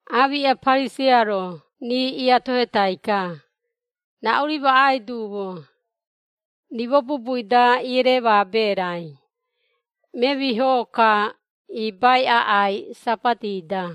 Aamiꞌa Pariseia-ro rii iatohetai-ka, “Raꞌu-ri maꞌai duumo, rimo bubui-da eremaabe raai, memiho-ka iibai aꞌai Sabati-da.”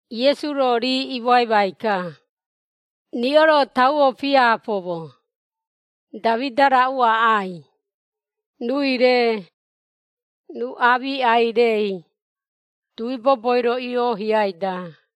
Iesu-ro rii imoaimai-ka, “Riꞌo-ro tauo piapoumo, Damida raꞌu aꞌai, ruui-re, ruu aamiꞌai-rei, dui boboi-ro iiohiai-da.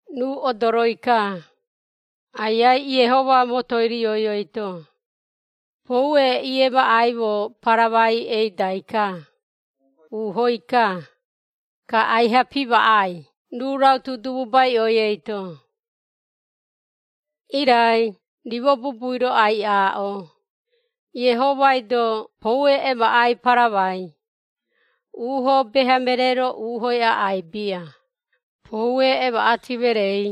Ruu odoroi-ka, Aiai Iehoma motoi rioi eito, poue iemaꞌaimo paramai eidai-ka, uuhoi-ka, ka aiha pimaꞌai ruu rautu dububaiꞌoi eito. Irai rimo bubui-ro ai-aaꞌo, Iehomai-do poue emaꞌai paramai, uuho beha meree-ro uuhoi aꞌai bia, poue emaꞌati mereei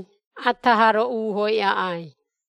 ata haa-ro uuhoi aꞌai.”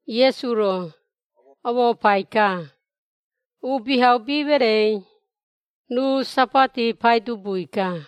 Iesu-ro, omoopai-ka, “Uubihaubi mereei, ruu Sabati Paidubui-ka.”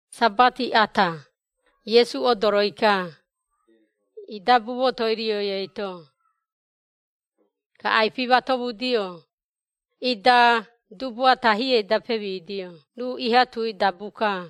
Sabati ata, Iesu odoroi-ka, idabu motoi rioi eito. Ka ai-pimatomudio, ida dubu ata hiei-da pemidio ruu iha tui dabu-ka.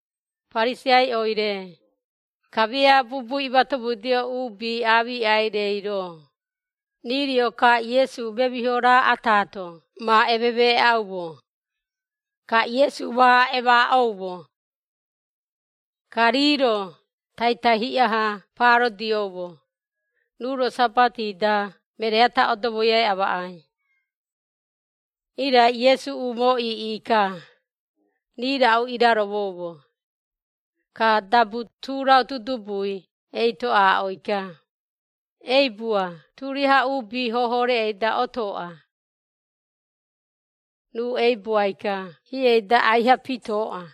Pariseiaiꞌoi-re, kamia bubu imatomudio uubi aamiꞌai-reiro, rii rio-ka Iesu memiho raa ataato ma ememeeꞌaumo, ka Iesu ma emaaꞌoumo. Ka rii-ro taitai hiꞌa-ha paarodiomo, ruu-ro Sabati-da meree ata odomoiai amaꞌai. Irai Iesu umoo iiꞌi-ka, rii raꞌu iraromoumo, ka tu dabu rautu dubui eito aaꞌoi-ka, “Eibua turiaha uubi hoho reꞌei-da otooꞌa.” Ruu eibuai-ka hiei-da aiha pitooꞌa.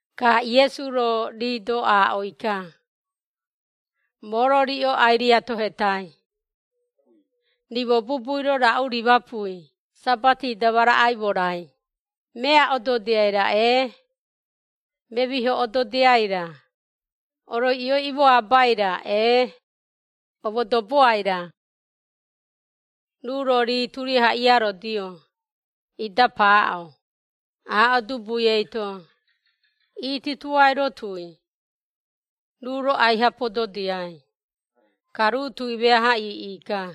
Ka Iesu-ro rii-do aaꞌoi-ka, “Moo-ro riꞌo ai-riatohetaii, rimo bubui-ro raꞌu rimapui Sabati-da ma raꞌaimo-rai, mea ododiai-ra ee, memiho ododiai-ra, oroiꞌioi omoabai-ra ee, omodoboai-ra?” Ruu-ro rii turiaha iiarodio, ida paaꞌo, aaꞌo dubui eito, “Itutuai roo tui.” Ruu-ro aiha pododiai, ka ruu tui meaha iiꞌi-ka.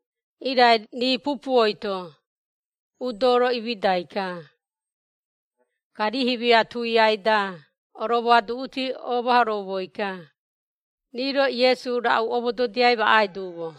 Irai rii pupuoi-to udo-ro, imidai-ka. Ka rii himia tuiai-da oromoaduꞌuti omahoroumoi-ka, rii-ro Iesu raꞌu omododiai maꞌai duumo.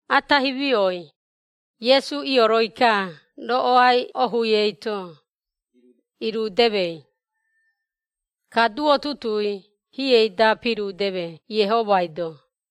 Ata himioi, Iesu ioroi-ka roꞌoai ohui eito, irudemei. Ka duo tutuui hiei-da pirudeme Iehomai-do.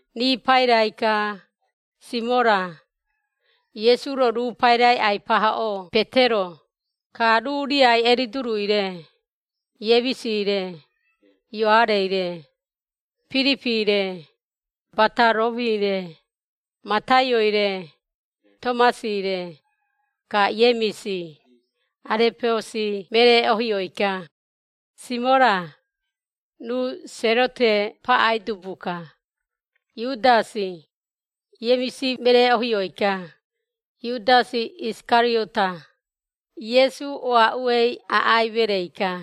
Rii pairai-ka, Simora (Iesu-ro ruu pairai ai-pahoꞌoo Petero) ka ruu riai Eridurui-re, Iemisi-re, Ioarei-re, Piripi-re, Bataromi-re, Mataioi-re, Tomasi-re, ka Iemisi (Arepeosi meree-ohioi-ka), Simora (ruu Serote paꞌai dubu-ka), Iudasi (Iemisi meree-ohioi-ka), Iudasi Isikariota, Iesu oaꞌuei aꞌai mereei-ka.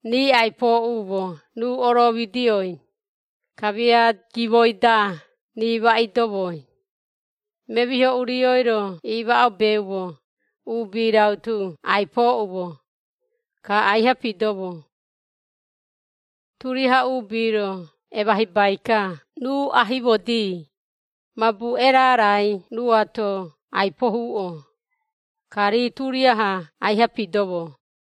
Rii ai-pooꞌumo ruu oroomidioi, kamia gimoi-da rii ma iidomoi, memiho urioi-ro iimaꞌobeumo uubi rautu ai-pooꞌumo, ka aiha piidomo. Turiaha uubi-ro emahibai-ka ruu ahimodi, mabu erarai ruuato ai-pohuꞌo, ka rii turiaha aiha pidomo.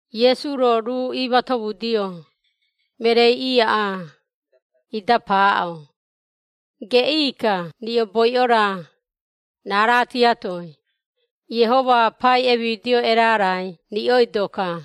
Iesu-ro ruu iimatomudio mereei iaꞌaa, ida paaꞌo, “Geꞌii-ka riꞌo boiꞌo-ra, raara tiatoi, Iehoma pai emidio erarai riꞌoido-ka!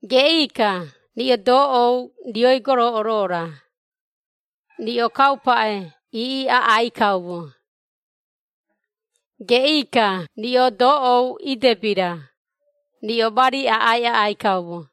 Geꞌii-ka riꞌo doꞌou rioi goroꞌoro-ra, riꞌo kaupaꞌe iiꞌi aꞌai kaumo! Geꞌii-ka riꞌo doꞌou idebi-ra, riꞌo mari aꞌai aꞌai kaumo!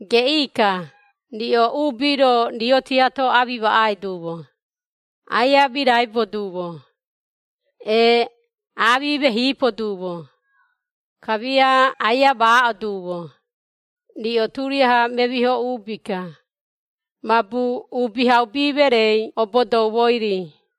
“Geꞌii-ka riꞌo uubi-ro rio-tiato amimaꞌai duumo, aia miraibo duumo, ee amimehipo duumo, kamia aia maaꞌo duumo, riꞌo turiaha memiho uubi-ka, mabu Uubihaubi mereei obodoumoi-ri.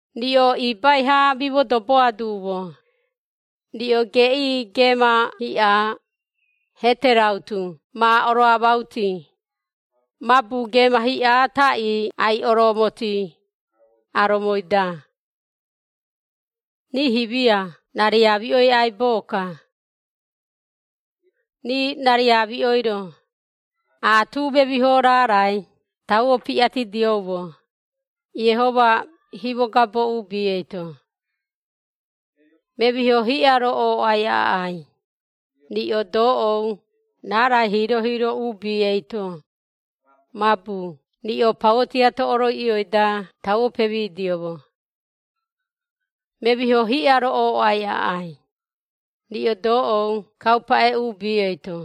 Riꞌo ibai-ha amimodoboa duumo, riꞌo geꞌii geema hiꞌa, hete rautu ma oroamauti, mabu geema hiꞌa taꞌii ai-oroomotii, aromoi-da. Rii himia rariamiꞌoi aibo-ka. Rii rariamiꞌoi-ro, aatu memiho raarai tauo piꞌatidioumo, Iehoma himogabo uubi eito. Memiho hiꞌa-ro ooꞌai aꞌai, riꞌo doꞌou raarai hiiro-hiiro uubi eito, mabu riꞌo pauo tiato oroiꞌioi-da tauo pemidioumo! Memiho hiꞌa-ro ooꞌai aꞌai, riꞌo doꞌou kaupaꞌe uubi eito,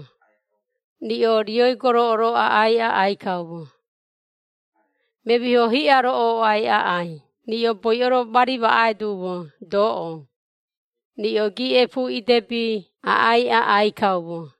riꞌo rioi goroꞌoro aꞌai aꞌai kaumo! Memiho hiꞌa-ro ooꞌai aꞌai riꞌo boiꞌo-ro mari maꞌai duumo doꞌou, riꞌo giiꞌepu idebi aꞌai aꞌai kaumo!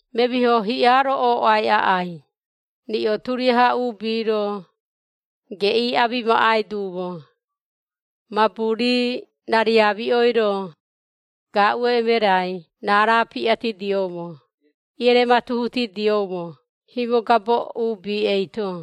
“Memiho hiꞌa-ro ooꞌai aꞌai, riꞌo turiaha uubi-ro, geꞌii amimaꞌai duumo, mabu rii rariamiꞌoi-ro, gaaꞌu emerai raara piꞌatidioumo ierematuhutidioumo himogabo uubi eito.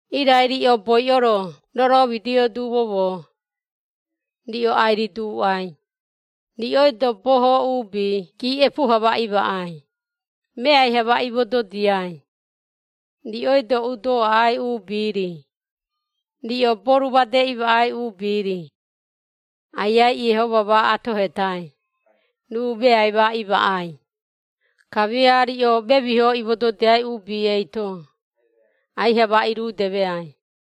“Irai riꞌo boiꞌo-ro roromidio duumo moo, riꞌo ai-riduuꞌai, riꞌoi-do boho uubi giiꞌepu-ha ma imaꞌai, meai-ha ma imododiai, riꞌoi-do udo aꞌai uubi-ri, riꞌo boru made imaꞌai uubi-ri, Aiai Iehoma ma atohetai, ruu meai ma imaꞌai, kamia riꞌo memiho imododiai uubi eito, aiha ma irudemeai.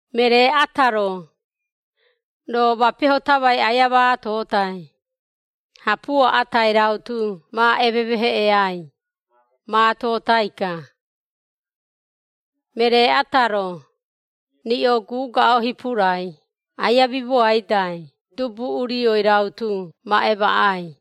Meree ata-ro, roo mapeho tamai aia maatotai, hapuo atai rautu ma ememeheꞌeai, maatotai-ka. Meree ata-ro, riꞌo gugaꞌo hipurai aia mimoaidai dubu-urioi rautu ma emaꞌai.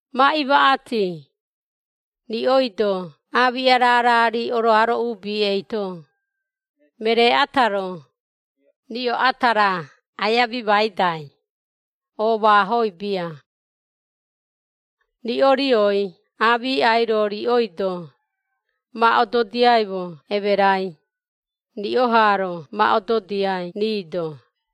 Ma imaꞌati, riꞌoi-do aamiꞌa raara-ri oroaro uubi eito, meree ata-ro, riꞌo ata raa aia mimaidai, oomaahoi bia. Riꞌo rioi aamiꞌai-ro, riꞌoi-do ma ododiaimo emerai, riꞌo haa-ro ma ododiai rii-do.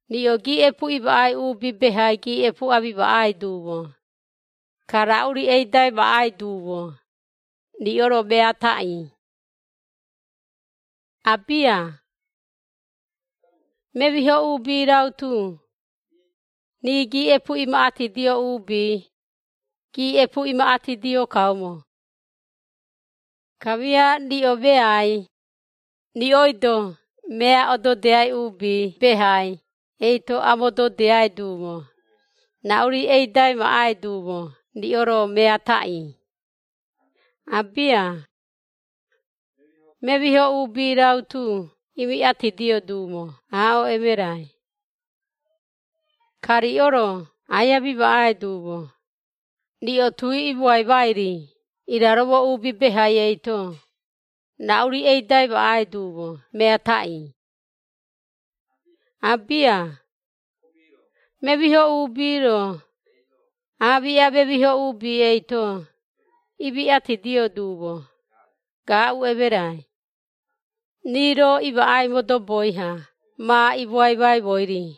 “Riꞌo giiꞌepu imaꞌai uubi behai giiꞌepu amimaꞌai duumo, ka raꞌu-ri eidai maꞌai duumo, riꞌo-ro mea taꞌii? Abia! Memiho uubi rautu, rii giiꞌepu imaꞌatidio uubi, giiꞌepu imaꞌatidio kaumo! Kamia riꞌo meai, riꞌoi-do mea ododiai uubi behai eito amododiai duumo, raꞌu-ri eidai maꞌai duumo riꞌo-ro mea taꞌii? Abia! Memiho uubi rautu imiꞌatidio duumo aaꞌo emerai! Ka riꞌo-ro aia mimaꞌai duumo, riꞌo tui imoaimai-ri iraromo uubi behai eito, raꞌu-ri eidai maꞌai duumo mea taꞌii? Abia! Memiho uubi-ro, aamiꞌa memiho uubi eito, imiꞌatidio duumo, gaaꞌu emerai, rii-ro imaꞌai modoboi-ha ma imoaimaimoi-ri!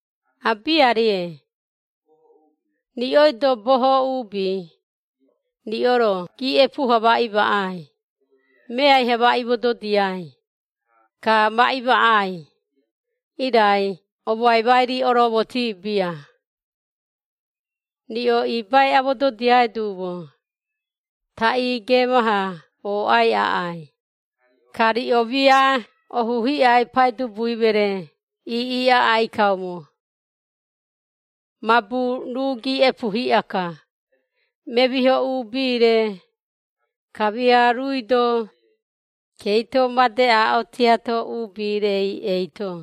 Abiarie! Riꞌoi-do boho uubi, riꞌo-ro giiꞌepu-ha ma imaꞌai, meai-ha ma imododiai, ka ma imaꞌai, irai omoaimai-ri, oroomotii bia. Riꞌo ibai amododiai duumo, taꞌii geema-ha ooꞌai aꞌai, ka riꞌo mia ohu hiꞌai Paidubui meree iiꞌi aꞌai kaumo. Mabu ruu giiꞌepu hiꞌa-ka, memiho uubi-re, kamia ruui-do, keito made aaꞌo tiato uubi-rei eito.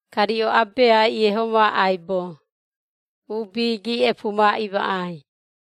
Ka riꞌo abeai Iehoma aibo, uubi giiꞌepu ma imaꞌai.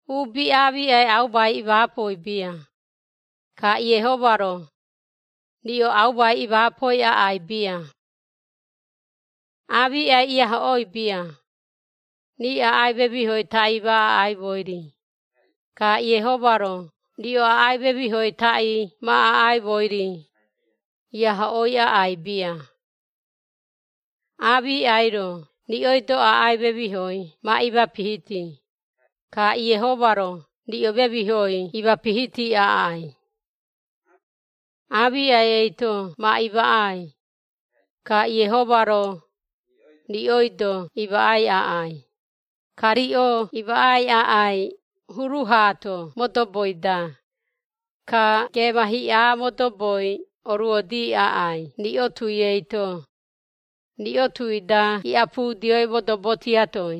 “Uubi aamiꞌai aumai imaapoi bia, ka Iehoma-ro, riꞌo aumai imaapoi aꞌai bia. Aamiꞌai iahoꞌooi bia, rii aꞌai memihoi taꞌii ma aꞌaimoi-ri, ka Iehoma-ro riꞌo aꞌai memihoi taꞌii ma aꞌaimoi-ri, iahoꞌooi aꞌai bia. Aamiꞌai-ro riꞌoi-do aꞌai memihoi ma imapihiti, ka Iehoma-ro riꞌo memihoi imapihiti aꞌai. Aamiꞌai eito ma imaꞌai, ka Iehoma-ro, riꞌoi-do imaꞌai aꞌai, ka riꞌo imaꞌai aꞌai huru haato modoboi-da, ka geema hiꞌa modoboi oruodii aꞌai riꞌo tui eito, riꞌo tui-da iꞌapudioi modobo tiatoi.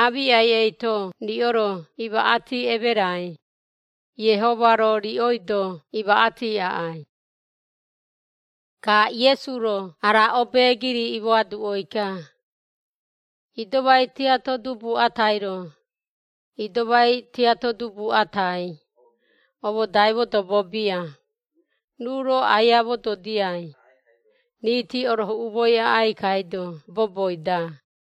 Aamiꞌai eito riꞌo-ro imaꞌati emerai, Iehoma-ro riꞌoi-do imaꞌati aꞌai.” Ka Iesu-ro ara obeegiri imoaduꞌoi-ka, “Idomai tiato dubu atai-ro, idomai tiato dubu atai, omodai modobo bia, ruu-ro aia mododiai, riiti orohuꞌumoi aꞌai kaido boboi-da.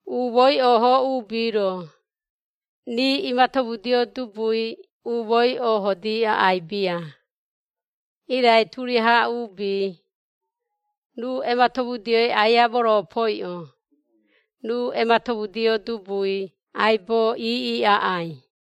Umooi ooho uubi-ro, rii imatomudio dubui umooi oohoodii aꞌai bia, irai turiaha uubi, ruu ematomudioi aia moropoiꞌo, ruu ematomudio dubui aibo iiꞌi aꞌai.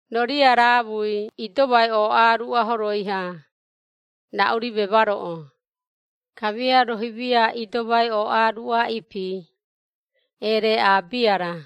“Roo riaraamui idomai ooꞌaa ruꞌa horoi-ha, raꞌu-ri memaroꞌo, kamia roo himia idomai ooꞌaa ruꞌa ipi, ereaꞌaa bia-ra?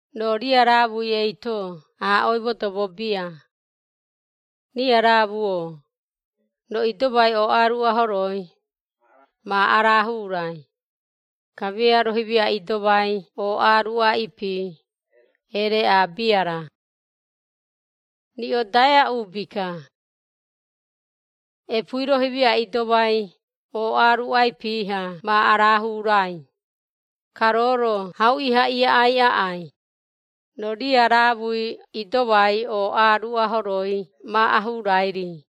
Roo riaraamui eito aaꞌoi modobo bia, ‘Riaraamu-o, roo idomai ooꞌa ruꞌa horoi, ma arahuurai,’ kamia roo himia idomai ooꞌa ruꞌa ipi, eereaꞌaa bia-ra? Riꞌo daea uubi-ka! Epuui roo himia idomai ooꞌaa ruꞌa ipi-ha ma araahurai, ka roo-ro hauꞌi-ha iaꞌai aꞌai, roo riaraamui idomai ooꞌa ruꞌa horoi ma ahuurai-ri.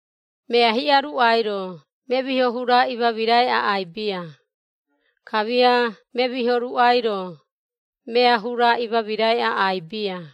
“Mea hiꞌa ruꞌai-ro memiho hura imamirai aꞌai bia, kamia memiho ruꞌai-ro, mea hura imamirai aꞌai bia.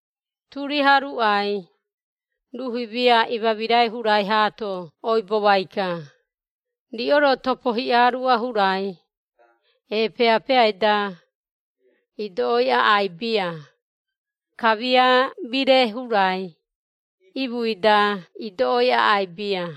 Turiaha ruꞌai, ruu himia imamirai hurai haato oibomai-ka, riꞌo-ro topo hiꞌa ruꞌa hurai, eepeeapeeai-da, idoꞌoi aꞌai bia, kamia mire hurai, iimuui-da idoꞌoi aꞌai bia.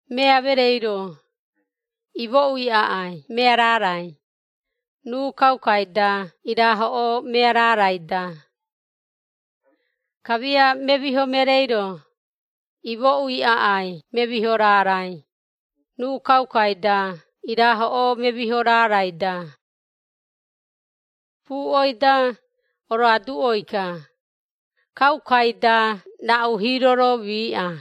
Mea mereei-ro, imooꞌui aꞌai mea raarai, ruu kaukai-da irahoꞌoo mea raarai-da. Kamia memiho mereei-ro, imooꞌui aꞌai memiho raarai, ruu kaukai-da irahoꞌoo memiho raarai-da. Puꞌoi-da, oroaduꞌoi-ka, kaukai-da raꞌu hiiro-ro miiꞌa.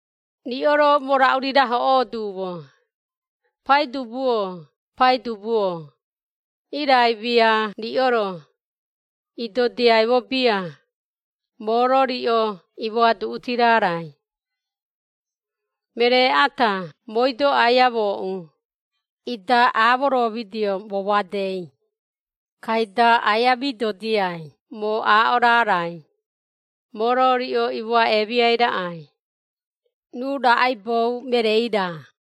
“Riꞌo-ro moo raꞌu-ri rahoꞌoo duumo, ‘Paidubu-o, Paidubu-o’, irai mia riꞌo-ro, idodiaimo bia, moo-ro riꞌo imoaduꞌuti raarai. Meree ata mooi-do aia mooꞌu, ida aamoromidio moo madei, kaida aia midodiai moo aaꞌo raarai, moo-ro riꞌo imoaꞌemiai raꞌai, ruu raꞌaibou mereei-ra.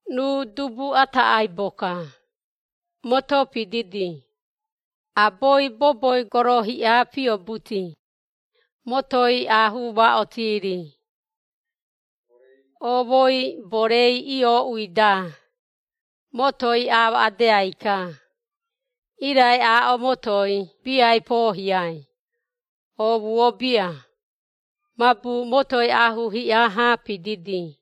Ruu dubu ata aibo-ka, moto pididi, aboi boboi goro hiꞌa piobuti, motoi aahuu ma otii-ri. Oomoi borei iooꞌui-da, motoi amaꞌadeai-ka, irai aaꞌo motoi biai poohiai, oomuo bia, mabu motoi aahuu hiꞌa-ha pididi.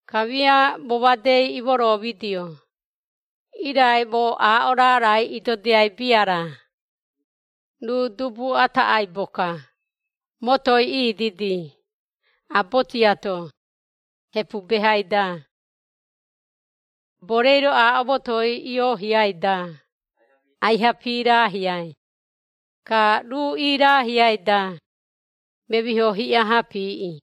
Kamia moo madei imoroomidio, irai moo aaꞌo raarai idodiai bia-ra, ruu dubu ata aibo-ka, motoi ididi, abo tiato, hepu behai-da. Borei-ro aaꞌo motoi iohiai-da, aiha piiraahiai, ka ruu iiraahiai-da, memiho hiꞌa ha piiꞌi!”